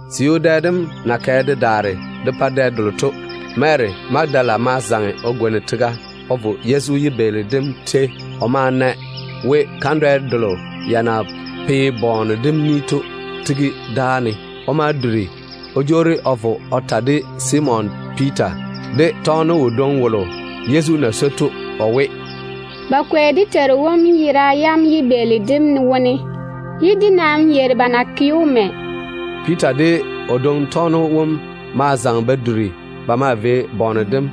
Siu dɛ dem na kɛ de daare de pa dɛ delo to, Ko kuri mo ye ‘Sunday’ tetete. Mary Magadala ma zaŋe o gwoni tega o vo Yezu yibeeli dem jeiga. O ma na we kandwɛ delo ya na pe bɔɔne dem ni to tigi dáa ne. O ma duri o jwoori o vo o ta de Simon Piita de tɔgeno wodwoŋi wom Yezu na swoi to o we, “Ba kwei dé Teiru wom yera yam yibeeli dem wone. Dé nam yeiri ba na ke‑o mɛ.” Piita de o dwoŋi tɔgeno wom ma zaŋe ba duri ba maa vei bɔɔne dem.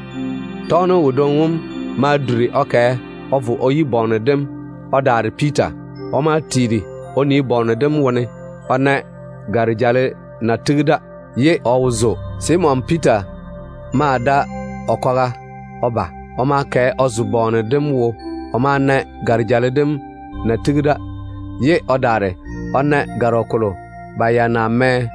Tɔgeno wodwoŋi wom ma duri o kɛ o vo o yi bɔɔne dem o daare Piita. O ma tiiri o nii bɔɔne dem wone o na gare-jale na tigi da, ye o wo zo. Simon Piita ma da o kwaga o ba. O ma kɛ o zo bɔɔne dem wo. O ma na gare-jale dem na tigi da, ye o ta na gɔrɔ kolo ba ya na mɛ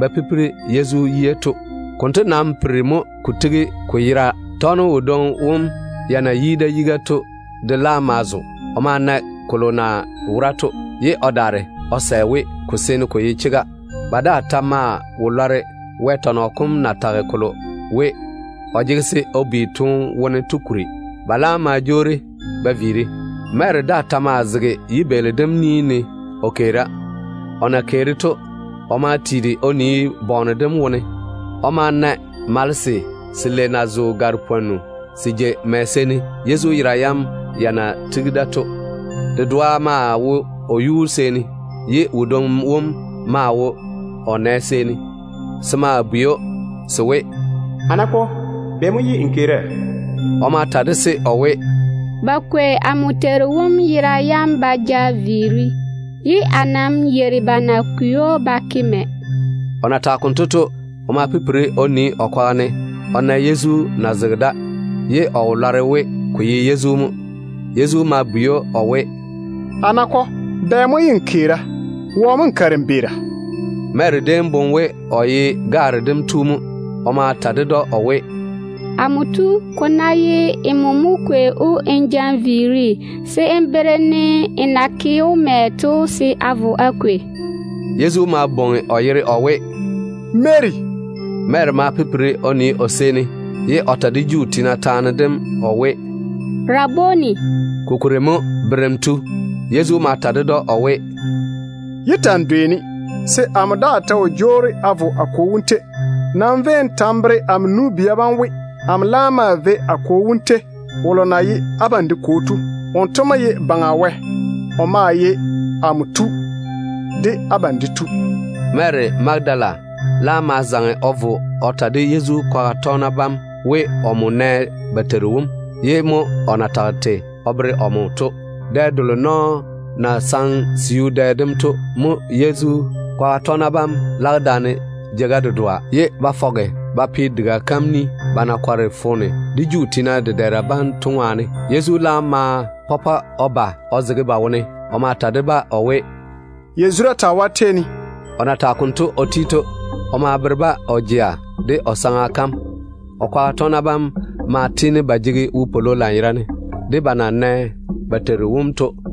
ba ba Yezu yuu to. Konto nam piri mo ko tigi ko yera. Tɔgeno wodwoŋi wom ya na lwoori o yi da to de laam ma zo. O ma na kolo na wora to, ye o daare o sɛ we ko seene ko ye chega. Ba daa ta maa wo lɔre Wɛ tɔnɔ kom na tage kolo we o jege se o bi toone wone to kuri. Ba laam ma jwoori ba viiri. Mary daa ta maa zege yibeeli dem ni ne o keera. O na wora o keera konto to, o ma tiiri o nii bɔɔne dem wone. O ma na malese selei na zo gare-pwonnu se jei mɛ seeni Yezu yera yam ya na tigi da to. Dedoa maa wo o yuu seeni, ye wodwoŋi wom maa wo o nɛ seeni. Se ma bwei‑o se we, “A nakɔ, bɛ mo ye n keera?” O ma ta de-se o we, “Ba kwei amo Teiru wom yera yam ba ja viiri, ye a nam yeiri ba na kwei‑o ba ke mɛ.” O na tage konto to, o ma pipiri o nii o kwaga ne o na Yezu na zege da, ye o wo lɔre we ko ye Yezu mo. Yezu ma bwei‑o o we, “A nakɔ, bɛ mo ye n keera? Wɔ mo nmo kare n beera?” Mary déem boŋe we o ye gaare dem tu mo. O ma ta ded‑o o we, “Amo tu, ko ná ye nmo mo kwei‑o n ja n viiri, se n bere-ne n na ke‑o mɛ to se a vo a kwei.” Yezu ma bwoŋi o yere o we, “Mary.” Mary ma pipiri o nii o seeni, ye o ta de Juu tiina taane dem o we, “Rabuni”, ko kuri mo ‘Berem tu’. Yezu ma ta ded‑o o we, “Yé ta‑n dwei-ne, se amo daa ta wo jwoori a vo a Kwo wom tei. Nam véi n ta n bere amo nu-bia bam we, amo laam maa vei a Kwo wom tei, wolo na ye abam de Kwo to. Wonto mo ye Baŋa Wɛ. O maa ye amo Tu de abam de Tu.” Mary Magadala laam ma zaŋe o vo o ta de Yezu kwaga tɔgena bam we, omo nɛ ba Teiru wom, ye o daare o ta kolo Yezu na tage o bere‑o to. Dɛ delo nɔɔ na saŋe siu dɛ dem to Ko ta ye ‘Sunday’ dɛ dem mo konto. mo Yezu kwaga tɔgena bam lage daane jeiga dedoa, ye ba fɔge ba pe diga kam ni, ba na kɔre foone de Juu tiina dedɛɛra bam to ŋwaane. Yezu laam ma pɔpɔ o ba o zege ba tetare ne. O ma ta de-ba o we, “Yazura taa wo á tei ne.” O na tage konto o ti to, o ma bere-ba o jea de o saŋa kam. O kwaga tɔgena bam maa tiini ba jege wopwolo lanyerane de ba na nɛ ba Teiru wom to.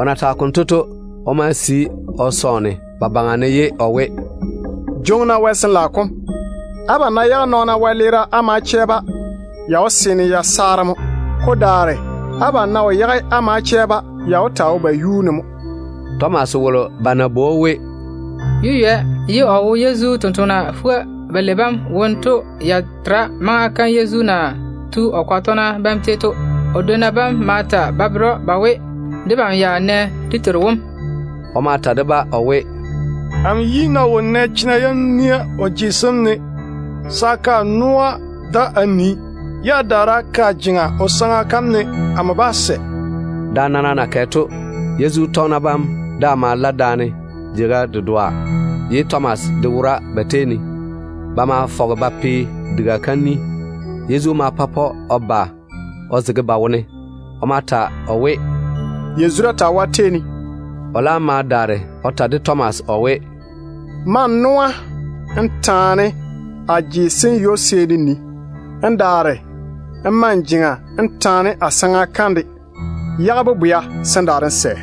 O na tage konto to, o ma sii o momwa vio o yage ba yera ne ye o we, “Jwoŋi-na Wɛ Sin-laao kom. Abam ná yage nɔɔno wolo wɛleera á ma chɛ‑o, ya wó seene ya saare mo. Ko daare abam ná wo yage á ma chɛ wolo, ya ta wó taa wo kotu yuu ne mo.” Tomas wolo ba na bwoi‑o we ‘Yeywɛ’ ye o wo Yezu tontoŋena fuga-balei bam wone to ya tera maŋa kam Yezu na tu o kwaga tɔgena bam tei to. O dwonna bam ma ta ba bere‑o ba we, “Debam ya nɛ dé Teiru wom.” O ma ta de-ba o we, “Amo yi ná wo nɛ chena yam nia o je sem ne se a ke a noa da a nii, ye a daare a ke a jeŋa o saŋa kam ne, amo bá sɛ.” Da nana na kɛ to, Yezu tɔgena bam daa ma la daane jeiga dedoa, ye Tomas de wora ba tei ne. Ba ma fɔge ba pe diga kam ni. Yezu ma pɔpɔ o ba o zege ba tetare ne. O ma ta o we, “Yazura taa wo á tei ne.” O laam ma daare o ta de Tomas o we, “Ma n noa n taane a je sem ywo-seeni n nii, n daare n tore n jeŋa a saŋa kam ne. Yage bobwea, se n daare n sɛ.”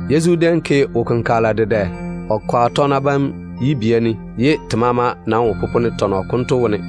Yezu déem ke wo-kenkagela dedɛ o kwaga tɔgena bam tetare ne, ye te maama nam wo popone tɔnɔ konto wone.